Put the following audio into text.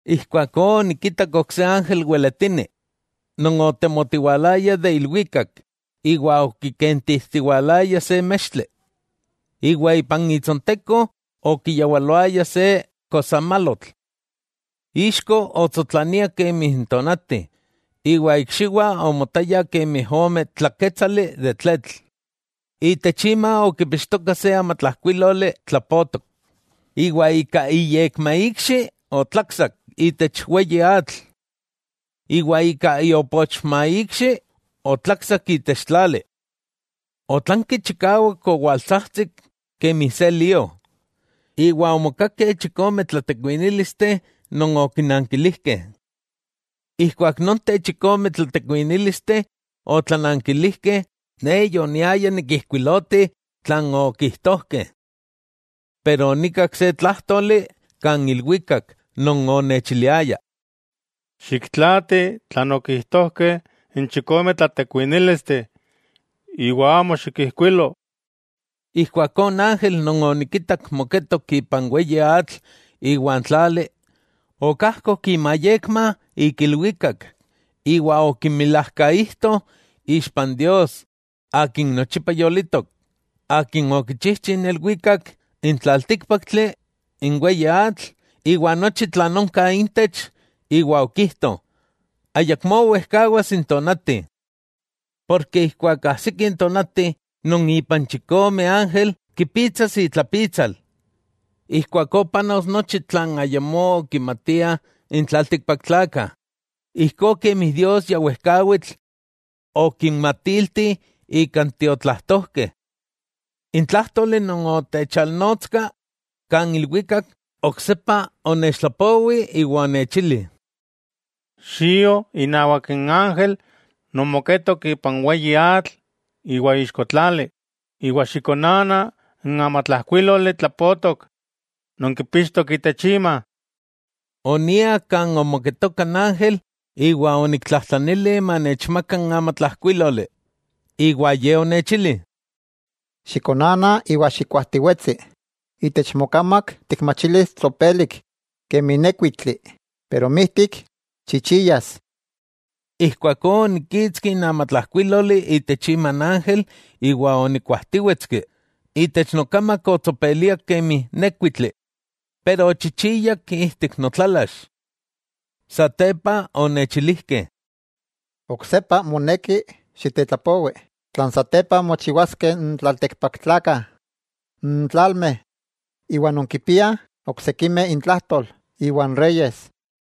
Ijkuakó onikitak ok se ángel weletini non otemotiwalaya de ilwikak iwa okikentijtiwalaya se mextli, iwa ipan itsonteko okiyawaloaya se kosamalotl. Ixko otsotlania kemi n tonati, iwa ikxiwah omotayah kemi ome tlakétsali de tletl. Itech ima okipixtoka se amatlajkuíloli tlapotok, iwa ika iyekmaikxi otlaksak itech weyi atl, iwa ika iopochmaikxi otlaksak itech tlali. Otlanki chikawak owaltsajtsik kemi se lío, iwa omokakeh chikome tlatekuinílisteh non okinankilijkeh. Ijkuak nonteh chikome tlatekuinílisteh otlanankilijkeh, ne yoniaya nikijkuiloti tlan okijtojkeh. San nima onikak se tlájtoli kan ilwikak non onechiliaya: —Xiktlaati tlan okijtojkeh n chikome tlatekuinílisteh, iwa amo xikijkuilo. Ijkuakó n ángel non onikitak moketok ipan weyi atl iwa n tlali, okajkok imayekma ik ilwikak iwa okimilajkaijto ixpa n Dios Akin nochipa yolitok, Akin okichijchi n ilwikak, n tlaltíkpaktli, n weyi atl iwa nochi tlan onka intech, iwa okijto: —Ayakmó wejkawas n tonati, porke ijkuak ajsiki n tonati non ipan chikome ángel kipitsas itlapitsal, ijkuakó panos nochi tlan ayamó okimatiah n tlaltikpaktlakah, ijkó kemi Dios ya wejkawitl okinmatiltih ika n tiotlajtojkeh. N tlájtoli non onechalnotska kan ilwikak oksepa onechtlapowi iwa onechili: —Xio inawak n ángel non moketok ipan weyi atl iwa ixko tlali, iwa xikonana n amatlajkuíloli tlapotok non kipixtok itech ima. Onia kan omoketoka n ángel iwa oniktlajtlanili manechmaka n amatlajkuíloli iwa Ye onechili: —Xikonana iwa xikuajtiwetsi. Itech mokamak tikmachilis tsopelik kemi n nékuitli, pero mijtik, chichiyas. Ijkuakó onikkitski n amatlajkuíloli itech ima n ángel iwa onikuajtíwetski; itech nokamak otsopeliak kemi nékuitli, pero ochichiyak ijtik notlalax. Satepa onechilijkeh: —Oksepa moneki xitetlapowi tlan satepa mochiwaskeh n tlaltikpaktlakah, n tlalmeh, iwa non kipiah oksikimeh intlajtol iwa n reyes.